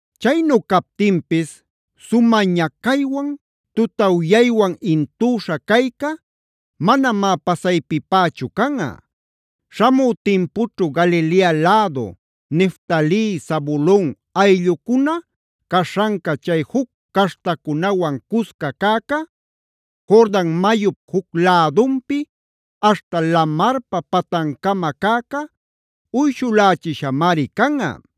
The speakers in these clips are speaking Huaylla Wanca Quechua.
Chaynu captinpis, sumä ñacaywan, tutawyaywan intüśha cayca, manamá pasaypipächu canꞌa. Śhamü timpućhu Galilea lädu, Neftali, Zabulon ayllucuna caśhanca, chay juc caśhtacunawan cusca cäca, Jordan mayup juc lädunpi aśhta lamarpa patancama cäca uyshulächishamari canꞌa.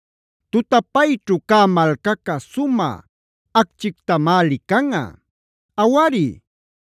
Tutapayćhu cä malcaca sumä acchictamá licanꞌa. Awari,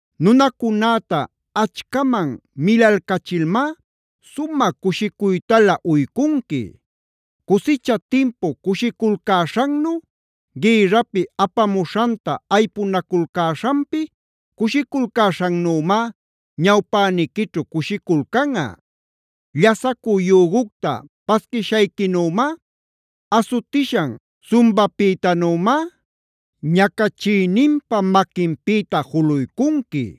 Nunacunäta achcaman milalcachilmá, sumä cushicuytalä uycunqui. Cusicha timpu cushiculcäśhannu, gïrrapi apamuśhanta aypunaculcäśhanpi cushiculcäśhannümá, ñawpäniquićhu cushiculcanꞌa. Llasacü yügucta paquishayquinümá, asutishan sumbapïtanümá, ñacachïninpa maquinpïta juluycunqui.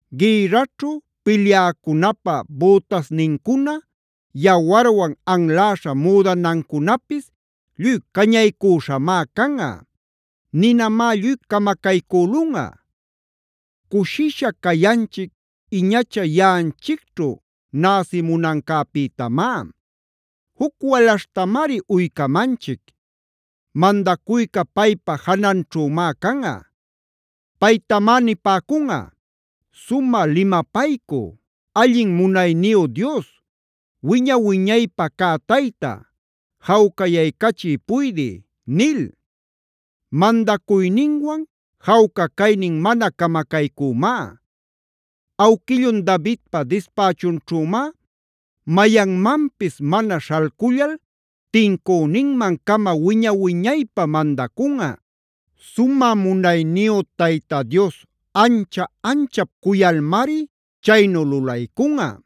Gïrraćhu pilyäcunapa bütasnincuna, yawarwan anläśha müdanancunapis lluy cañaycüśhamá canꞌa; ninamá lluy camacaycülunꞌa. Cushisha cayanchic iñacha yaꞌanchicćhu näsimunancäpïtamá; juc walaśhtamari uycamanchic. Mandacuyca paypa jananćhümá canꞌa; paytamá nipäcunꞌa: “Sumä Limapaycü, Allin Munayniyu Dios, Wiña-wiñaypä cä Tayta, Jawcayaycachï Puydï” nil. Mandacuyninwan jawca caynin mana camacaycümá. Awquillun Davidpa dispächunćhümá mayanmanpis mana śhalcullal tincüninmancama wiña-wiñaypä mandacunꞌa.d Sumä munayniyu Tayta Dios ancha-anchap cuyalmari chaynu lulaycunꞌa.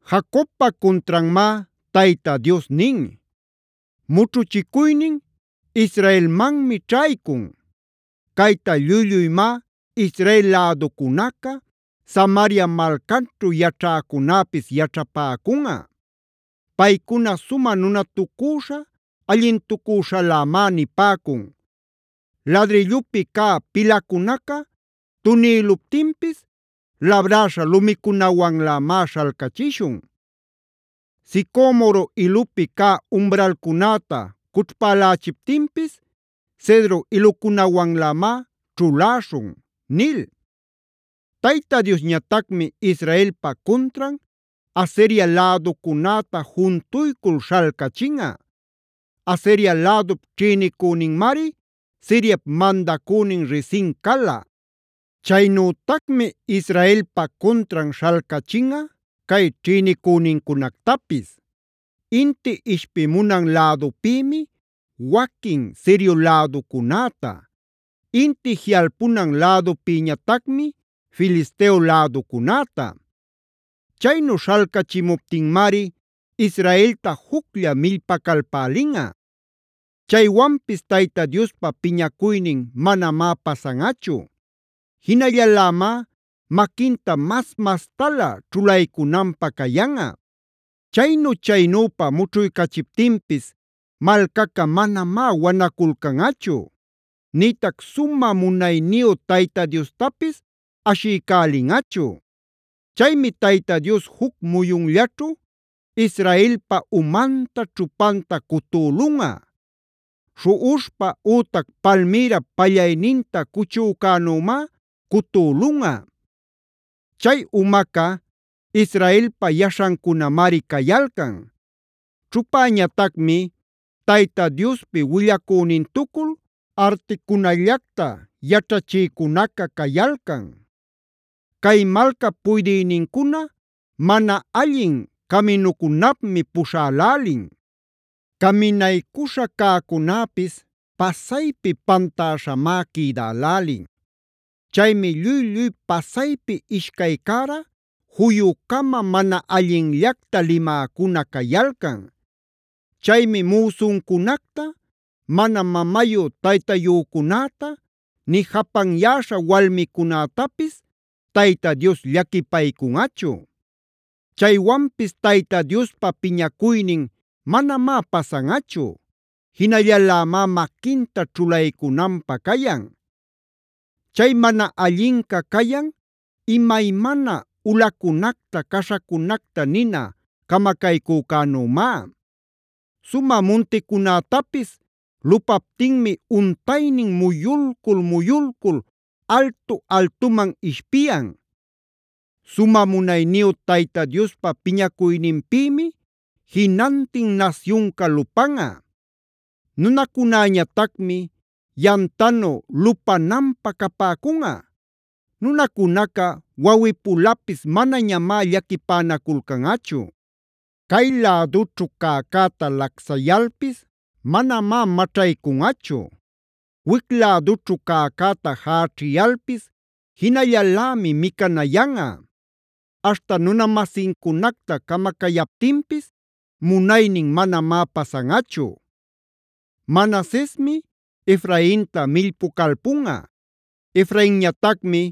Jacobpa cuntranmá Tayta Dios nin; mućhuchicuynin Israelmanmi ćhaycun. Cayta lluy-lluymá Israel läducunaca, Samaria malcanćhu yaćhäcunäpis yaćhapäcunꞌa. Paycuna sumä nutatucüśha, allintucüśhalämá nipäcun: “Ladrillupi cä pilacunaca tunïluptinpis, labräśha lumicunawanlämá śhalcächishun. Sicomoro ilupi cä umralcunäta cućhpälächiptinpis, Cedro ilucunawanlämá ćhuläśhun” nil. Tayta Diosñatacmi Israelpa cuntran Asiria läducunäta juntuycul śhalcachinꞌa. Asiria lädup ćhïnicüninmari Siriap mandacünin Rezin cala. Chaynütacmi Israelpa cuntran śhalcachinꞌa cay ćhïnicünincunactapis: Inti ishpimunan lädupïmi waquin Sirio läducunäta; inti jiꞌalpunan lädupïñatacmi Filisteo läducunäta. Chaynu śhalcachimuptinmari Israelta juclla millpacalpälinꞌa. Chaywanpis Tayta Diospa piñacuynin manamá pasanꞌachu; jinallalämá maquinta mas-mastalä ćhulaycunanpä cayanꞌa. Chaynu-chaynüpa mućhuycachiptinpis malcaca manamá wanaculcanꞌachu; nïtac sumä munayniyu Tayta Diostapis ashiycälinꞌachu. Chaymi Tayta Dios juc muyunllaćhu Israelpa umanta, ćhupanta cutülunꞌa; śhuꞌuśhpa ütac palmïrap pallayninta cuchücänümá cutülunꞌa. Chay umaca, Israelpa yaśhancunamari cayalcan; ćhupäñatacmi Tayta Diospi willacünintucul articunallacta yaćhachïcunaca cayalcan. Cay malcap puydïnincuna mana allin caminucunapmi puśhälälin. Caminaycuśha cäcunäpis pasaypi pantäśhamá quïdälälin. Chaymi lluy-lluy pasaypi ishcay cära, juyucama, mana allinllacta limäcuna cayalcan. Chaymi müsuncunacta, mana mamayu-taytayücunäta, nï japanyäśha walmicunätapis Tayta Dios llaquipaycunꞌachu. Chaywanpis Tayta Diospa piñacuynin manamá pasanꞌachu; jinallalämá maquinta ćhulaycunanpä cayan. Chay mana allinca cayan imaymana ulacunacta, caśhacunacta nina camacaycücänümá. Sumä munticunätapis lupaptinmi untaynin muyulcul-muyulcul altu-altuman ishpiyan. Sumä munayniyu Tayta Diospa piñacuyninpïmi jinantin nasyunca lupanꞌa; nunacunäñatacmi yamtanu lupananpä capäcunꞌa. Nunacunaca wawꞌipulapis manañamá llaquipänaculcanꞌachu. Cay lädućhu cäcäta lacsayalpis manamá maćhaycunꞌachu; wic lädućhu cäcäta jächiyalpis jinallalämi micanayanꞌa. Aśhta nunamasincunacta camacayaptinpis munaynin manamá pasanꞌachu. Manasesmi Efrainta millpucalpunꞌa; Efrainñatacmi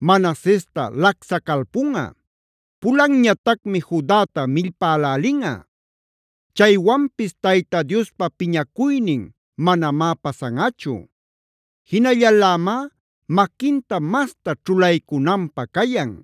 Manasesta lacsacalpunꞌa. Pulanñatacmi Judata millpälälinꞌa. Chaywanpis Tayta Diospa piñacuynin manamá pasanꞌachu; jinallalämá maquinta masta ćhulaycunanpä cayan.